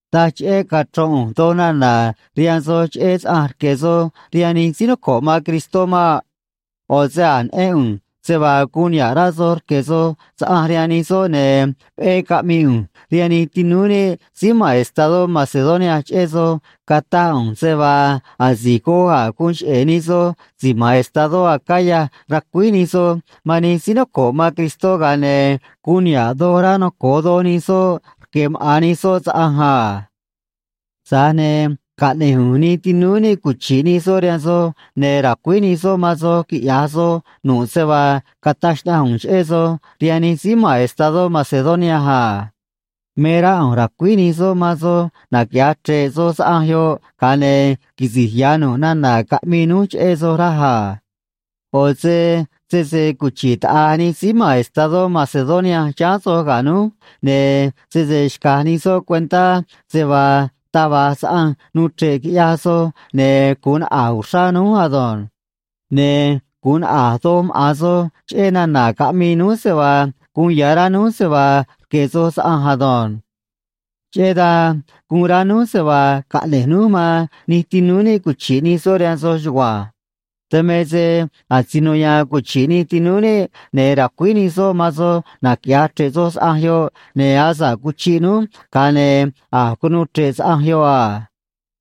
Taj cheꞌé cachro̱n ꞌu̱nj doj nana̱ rihaan soj cheꞌé saꞌanj rque̱ soj rihaan nij síí noco̱ꞌ man Cristó maꞌ. ꞌO̱ se a̱j neꞌén ꞌu̱nj se vaa guun niha̱ꞌ rá soj rque̱ soj saꞌanj rihaan nij soꞌ, ne̱ veꞌé caꞌmii ꞌu̱nj rihaan nij tinúú níꞌ síí ma̱n estadó Macedonia cheꞌé soj, cataj ꞌu̱nj se vaa asi̱j goj a̱j guun cheꞌe̱ nij soj si̱j ma̱n estadó Acaya racuíj nij soj man nij síí noco̱ꞌ man Cristó, ga̱a ne̱ guun niha̱ꞌ doj rá noco̱o doj nij soꞌ rque̱ maꞌa̱n nij soꞌ saꞌanj a. Tza̱j ne̱ caꞌne̱j ꞌu̱nj nij tinúú níꞌ cuchi̱ꞌ nij soꞌ rihaan soj, ne̱ ra̱cuíj nij soꞌ man soj quiꞌya̱j soj nu̱ꞌ se vaa cataj xnaꞌanj ꞌu̱nj cheꞌé soj rihaan nij síí ma̱n estadó Macedonia a. Me rá ꞌu̱nj ra̱cuíj nij soꞌ man soj naquiꞌya̱j chre̱ꞌ soj saꞌanj yoꞌ, ga̱a ne̱ quisi̱j ya̱ nu̱ꞌ nana̱ caꞌmii núj cheꞌé soj, raj a. ꞌO̱ se sese cuchi̱ꞌ taꞌa̱j nij síí ma̱n estadó Macedonia chiháán soj ga̱ núj, ne̱ sese xca̱j nij soꞌ cuentá se vaa taj va̱j saꞌanj nuu chre̱ꞌ quiꞌyaj soj, ne̱ gu̱un naꞌa̱j uxrá núj ado̱nj. Ne̱ gu̱un naꞌa̱j doj maꞌa̱n soj cheꞌé nana̱ caꞌmii núj se vaa guun ya̱ rá núj se vaa rque̱ soj saꞌanj ado̱nj. Cheꞌé dan guun rá núj se vaa caꞌne̱j núj man nij tinúú níꞌ cuchi̱ꞌ nij soꞌ rihaan soj chugua̱nj. Dan me se asino ya̱a̱n cuchi̱ꞌ nij tinúú níꞌ, ne̱ ra̱cuíj nij soꞌ man soj naquiꞌya̱j chre̱ꞌ soj saꞌanj yoꞌ, ne̱ asa̱ꞌ cuchiꞌ núj, ga̱a ne̱ a̱j cunuu chre̱ꞌ saꞌanj yoꞌ a.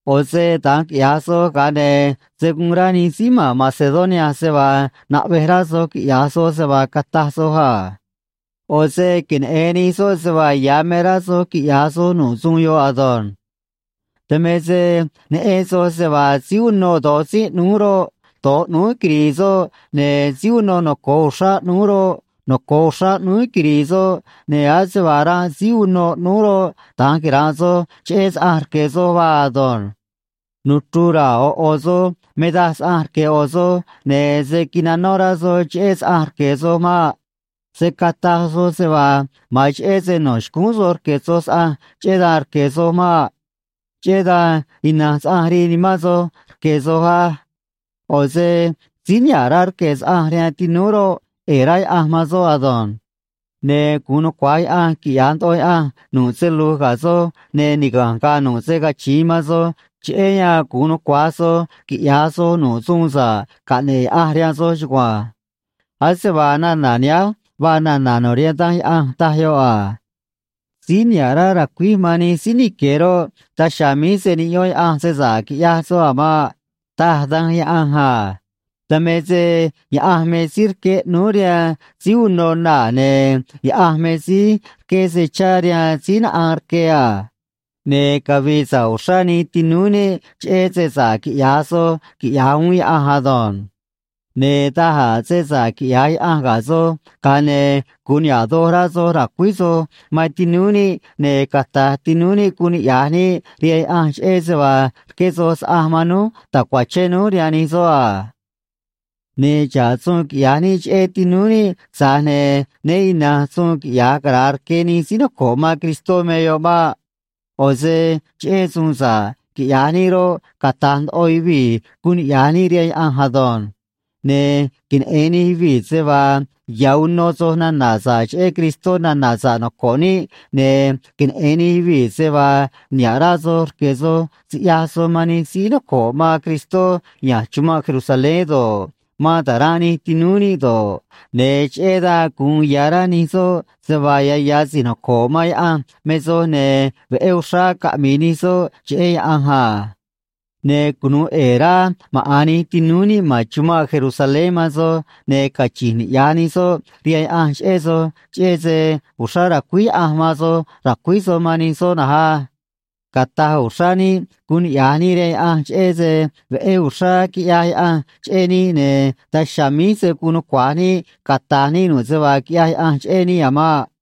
ꞌO̱ se da̱nj quiꞌya̱j soj, ga̱a ne̱ se̱ guun rá nij síí ma̱n Macedonia se vaa naꞌvej rá soj quiꞌya̱j soj se vaa cataj soj a. ꞌO̱ se queneꞌe̱n nij soꞌ se vaa ya̱ me rá soj quiꞌya̱j soj nu̱ꞌ suun yoꞌ ado̱nj. Dan me se neꞌen soj se vaa síí unô do̱j tzínꞌ ꞌnúú roꞌ, do̱j ꞌnúú quiri̱i̱ soꞌ, ne̱ síí unô noco̱o uxrá ꞌnúú roꞌ, noco̱o uxrá ꞌnúú quiri̱i̱ soꞌ, ne̱ ase vaa ranꞌ síí unô ꞌnúú roꞌ, da̱nj quira̱nꞌ soj cheꞌé saꞌanj rque̱ soj vaa ado̱nj. Nuchru̱j ra̱a̱ ꞌo̱ ꞌo̱ soj me daj saꞌanj rque̱ ꞌo̱ soj, ne̱ se̱ quinanó rá soj cheꞌé saꞌanj rque̱ soj maꞌ. Se̱ cataj soj se vaa ma̱an cheꞌé se no̱ xcúún soj rque̱ soj saꞌanj, cheꞌé dan rque̱ soj maꞌ. Cheꞌé dan ina̱nj saꞌanj rii nimán soj roꞌ, rque̱ soj á. ꞌO̱ se síí niha̱ꞌ rá rque̱ saꞌanj rihaan tinúú roꞌ, ꞌe̱e̱ rá Yaꞌanj man soꞌ ado̱nj. Ne̱ gu̱un nucua̱j Yaꞌanj quiꞌya̱j ndoꞌo Yaꞌanj nu̱ꞌ se lu̱j ga̱ soj, ne̱ niga̱nj ga̱a̱ nu̱ꞌ se cachi̱in man soj, cheꞌé yan gu̱un nucua̱j soj quiꞌya̱j soj nu̱ꞌ suun sa̱ꞌ caꞌne̱ꞌ Yaꞌanj rihaan soj chugua̱nj. Ase vaa nana̱ nihánj vaa nana̱ no̱ rihaan Danj Yaꞌanj, taj yoꞌ a: Síí niha̱ꞌ rá ra̱cuíj man nij síí nique̱ roꞌ, daj chiha̱a̱ míj se̱ niꞌyón Yaꞌanj se sa̱ꞌ quiꞌyaj soꞌ a̱ maꞌ, taj Danj Yaꞌanj a. Dan me se Yaꞌanj me síí rqué ꞌnúú rihaan síí unô naa̱, ne̱ Yaꞌanj me síí rqué se chá rihaan síí naꞌaan rque a. Ne̱ cavi̱i̱ sa̱ꞌ uxrá nij tinúú níꞌ cheꞌé se sa̱ꞌ quiꞌya̱j soj, quiꞌya̱j uún Yaꞌanj ado̱nj. Ne̱ da̱j a̱ se sa̱ꞌ quiꞌya̱j Yaꞌanj ga̱ soj, ga̱a ne̱ gu̱un niha̱ꞌ doj rá soj ra̱cuíj soj man tinúú níꞌ, ne̱ cata̱j tinúú níꞌ guun niꞌya̱j níꞌ rihaan Yaꞌanj cheꞌé se vaa rqué soj saꞌanj man núj ta̱cuachén núj rihaan nij soꞌ a. Ne̱ xa̱ꞌ suun quiꞌya̱j níꞌ cheꞌé tinúú níꞌ, tza̱j ne̱ né ina̱nj suun quiꞌya̱j cara̱a rque nij síí noco̱ꞌ man Cristó me yoꞌ maꞌ. ꞌO̱ se cheꞌé suun sa̱ꞌ quiꞌya̱j níꞌ roꞌ, cata̱j ndoꞌo yuvii̱ guun niꞌya̱j níꞌ rihaan Yaꞌanj ado̱nj. Ne̱ queneꞌe̱n nij yuvii̱ se vaa ya̱ uno soj nana̱ sa̱ꞌ cheꞌé Cristó nana̱ sa̱ꞌ noco̱ꞌ níꞌ, ne̱ queneꞌe̱n nij yuvii̱ se vaa niha̱ꞌ rá soj rque̱ soj siꞌyaj soj man nij síí noco̱ꞌ man Cristó ya̱nj chumanꞌ Jerusalén do̱ꞌ, man ta̱ranꞌ nij tinúú níꞌ do̱ꞌ, ne̱ cheꞌé dan gu̱un ya̱ rá nij soꞌ se vaa ya̱ ya̱ si̱j noco̱ꞌ man Yaꞌanj me soj, ne̱ veꞌé uxrá caꞌmi̱i̱ nij soꞌ cheꞌé Yaꞌanj a. Ne̱ cunu̱u ꞌe̱e̱ rá maꞌa̱n nij tinúú níꞌ ma̱n chumanꞌ Jerusalén man soj, ne̱ cachi̱nj niꞌya̱j nij soꞌ rihaan Yaꞌanj cheꞌé soj, cheꞌé se uxrá racuíj Yaꞌanj man soj ra̱cuíj soj man nij soꞌ na̱nj á. Cata̱j uxrá níꞌ guun niꞌya̱j níꞌ rihaan Yaꞌanj cheꞌé se veꞌé uxrá quiꞌyaj Yaꞌanj cheꞌé níꞌ, ne̱ daj chiha̱a̱ míj se̱ guun nucua̱j níꞌ cata̱j níꞌ nu̱ꞌ se vaa quiꞌyaj Yaꞌanj cheꞌé níꞌ a̱ maꞌ.